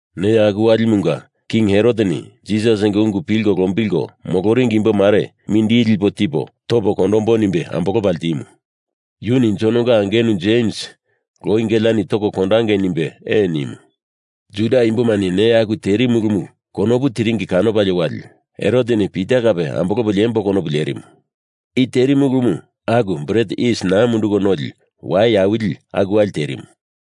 Neya aku walimunga King Heroteni Jisasinga ungu pilko lombilko moloringi imbo mare mindili lipo tipo topo kondombo nimbe ambolopa ltimu. Yuni Jononga angenu Jems loi geleani toko kondangei nimbe ee nimu. Juda imbomani neya aku terimu ulumu konopu tiringina kanopalie wali Heroteni Pita kape ambolopo liembo konopu lerimu. (I terimu ulumu aku Bret Yis Naa Munduko Noli wai awili aku wali terimu.)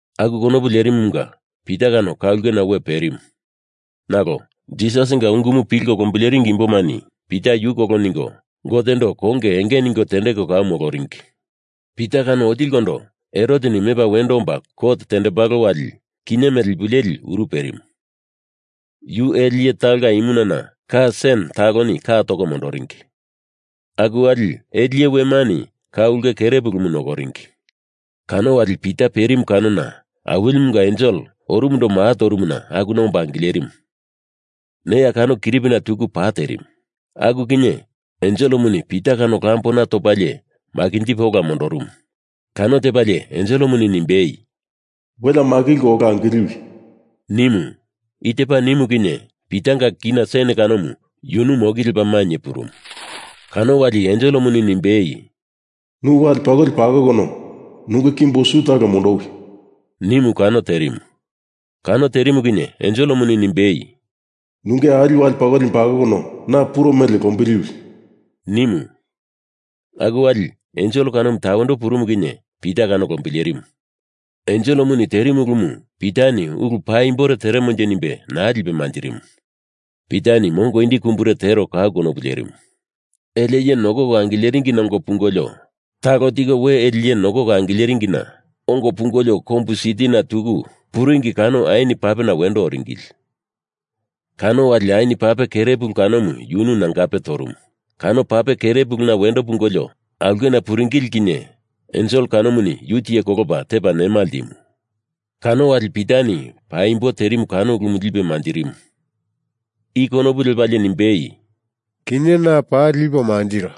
Aku konopu lerimumunga Pita kano ka ulkena we perimu. Nalo Jisasinga ungumu pilko lombileringi imbomani Pita yu kolo ningo Gotendo konge enge ningo tendeko kau moloringi. Pita kano otilikondo Heroteni mepa wendo omba kot tendembalo wali kinye mele ipu leli uru perimu. Yu ele iye talonga imunana ka sen taloni ka toko mondoringi. Aku wali ele iye wemani ka ulke kere pulumu nokoringi. Kano wali Pita perimu kanona Awilimunga ensel orumundo maa torumuna akuna omba angilerimu. Ne kano kiripina tuku pa terimu. Aku kinye enselemuni Pita kano lambona topalie makinjipe ola mondorumu. Kano tepalie enselemuni nimbei, “Welea makilko ola angiliwi,” nimu. I tepa nimu kinye Pitanga kina ka sen kanomu yunu moki lepa mainye purumu. Kano wali enselemuni nimbei, “Nu wale pakoli pakokono nunge kimbo su talo mondowi,” nimu kano terimu. Kano terimu kinye enselemuni nimbei, “Nunge ali wale pakolimu pakokono na puro mele lombiliwi,” nimu. Aku wali ensel kanomu tawendo purumu kinye Pita kano lombilerimu. Enselemuni terimu ulumu Pitani ulu paimbore teremonje nimbe naa lipe manjirimu. Pita mongo indi kumbure tero kau konopu lerimu. Ele iye nokoko angileringina ongo pungolio talo tiko we ele iye nokoko angileringina ongo pungolio kombu sitina tuku puringi kano ain papena wendo oringili. Kano wali ain pape kere pulu kanomu yunu nangape torumu. Kano pape kere puluna wendo pungolo aulkena puringili kinye ensel kanomuni yu tiye kolopa tepa nema ltimu. Kano wali Pitani paimbo terimu kano ulumu lipe manjirimu. I konopu lepalie nimbei, “Kinye na paa lipo mantiro.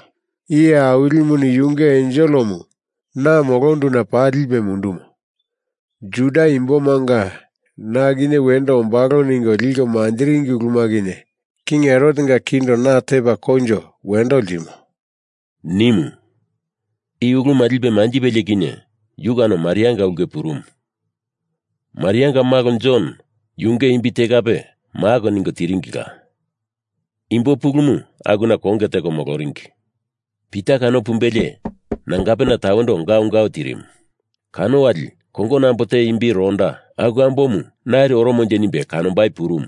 Iye Awilimuni yunge enselemu na molonduna paa lipe mundumo. Juda imbomanga na kinye wendo ombalo ningo liko manjiringi uluma kinye King Herotenga kindo na tepa koinjo wendo ltimo,” nimu. I uluma lipe manjipelie kinye yu kano Marianga ulke purumu. Marianga malo Jon yunge imbi te kape Mak ningo tiringila. Imbo pulumu akuna konge teko moloringi. Pita kano pumbelie nangape tawendo gaungau tirimu. Kano wali kongono ambo te imbi Roda, aku ambomu nari oromonje nimbe kanombai purumu.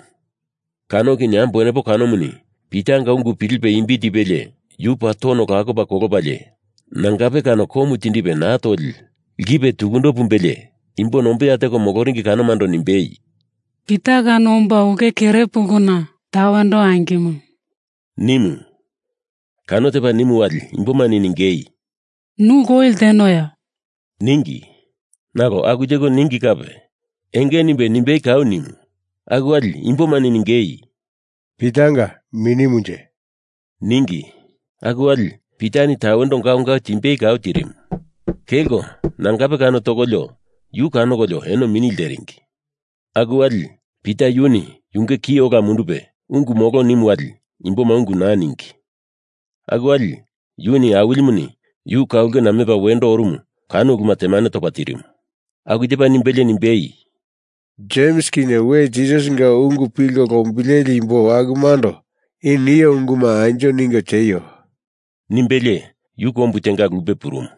Kano kinye ambo wenepo kanomuni Pitanga ungu pilipe imbi tipelie yu paa tono lakopa kolopalie nangape kano komu tindipe naa toli lkipe tukundo pumbelie imbo nombeya teko moloringi kanomando nimbei, “Pita kano omba ulke kere puluna tawendo angimo,” nimu. Kano tepa nimu wali imbomani ningei, “Nu loi ltenoya?” ningi. Nalo aku teko ningi kape enge nimbe, nimbei kau nimu. Aku wali imbomani ningei, “Pitanga minimunje,” ningi. Aku wali Pitani tawendo gaungau timbei kau tirimu. Kelko nangape kano tokolio yu kanokolio eno mini lteringi. Aku wali Pita yuni yunge ki ola mundupe ungu molo nimu wali imboma ungu naa ningi. Aku wali yuni Awilimuni yu ka ulkena mepa wendo orumu kano uluma temane topa tirimu. Aku tepa nimbelie nimbei, “Jems kinye we Jisasinga ungu pilko lombileli imbo akumando i nio unguma anjo ningo tieio,” nimbelie yu kombu tenga lupe purumu.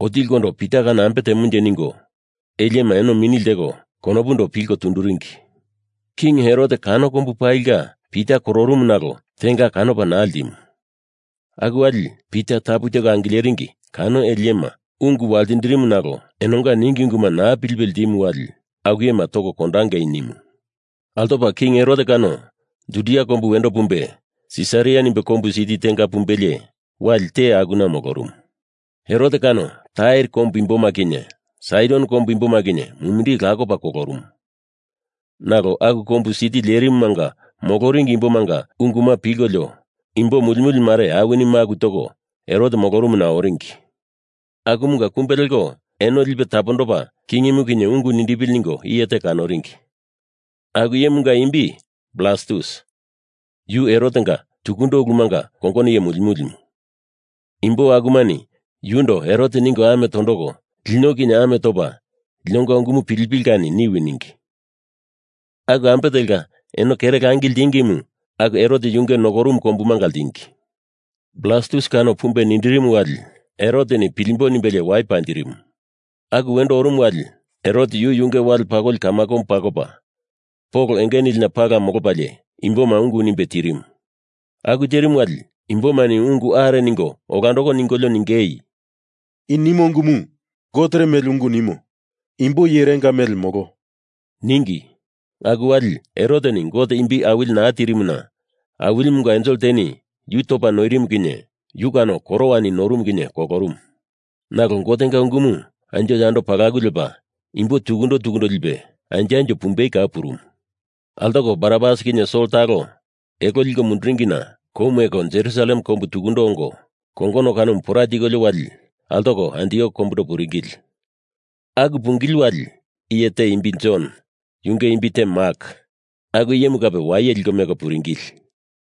Otilikondo Pita kano ambe temonje ningo ele iyema eno mini lteko konopundo pilko tunduringi. King Herot kano kombu palinga Pita kororumu nalo tenga kanopa naa ltimu. Aku wali Pita tapu teko angileringi kano ele iyema ungu waltindirimu nalo enonga ningi unguma naa pilipe ltimu wali aku iyema toko kondangei, nimu. Altopa King Herot kano Judia kombu wendo pumbe Sisaria nimbe kombu siti tenga pumbelie, wali te akuna molorumu. Herot kano Tair kombu imboma kinye Saidon kombu imboma kinye mumindili lakopa kolorumu. Nalo aku kombu siti lerimumanga moloringi imbomanga unguma pilkolio imbo mulimuli mare awini maku toko Herot molorumuna oringi. Akumunga kumbe leko eno lipe tapondopa kingimu kinye ungu nindipili ningo iye te kanoringi. Aku iyemunga imbi Blastus, yu Herotenga tukundo ulumanga kongono iye mulimulimu. Imbo akumani yundo Herot ningo ame tondoko lino kinye ame topa linonga ungumu pilipili kani niwi ningi. Aku ambe telka eno kere langi ltingimu aku Herot yunge nokorumu kombumanga ltingi. Blastus kano pumbe nindirimu wali Heroteni pilimbo nimbelie wai panjirimu. Aku wendo orumu wali, Herot yu yunge wale pakoli kamakomu pakopa Pol enge nilina pala molopalie imboma ungu nimbe tirimu. Aku terimu wali imbomani ungu are ningo olandoko ningolio ningei, “I nimo ungumu gotere mele ungu nimo. Imbo iyerenga mele molo,” ningi. Aku wali Heroteni Gote imbi awili naa tirimuna Awilimunga ensel teni yu topa noirimu kani yu kano korowani norumu kinye kolorumu. Nalo Gotenga ungumu anjo yando palaku lepa imbo tukundo tukundo lipe anjo anjo pumbei kau purumu. Altoko Barnabas kinye Sol talo elo liko munduringina kou meko Jerusalem kombu tukundo ongo kongono kanomu pora tikolio wali altoko Antiok kombundo puringili. Aku pungili wali iye te imbi Jon yunge imbi te Mak aku iyemu kape waye liko meko puringili.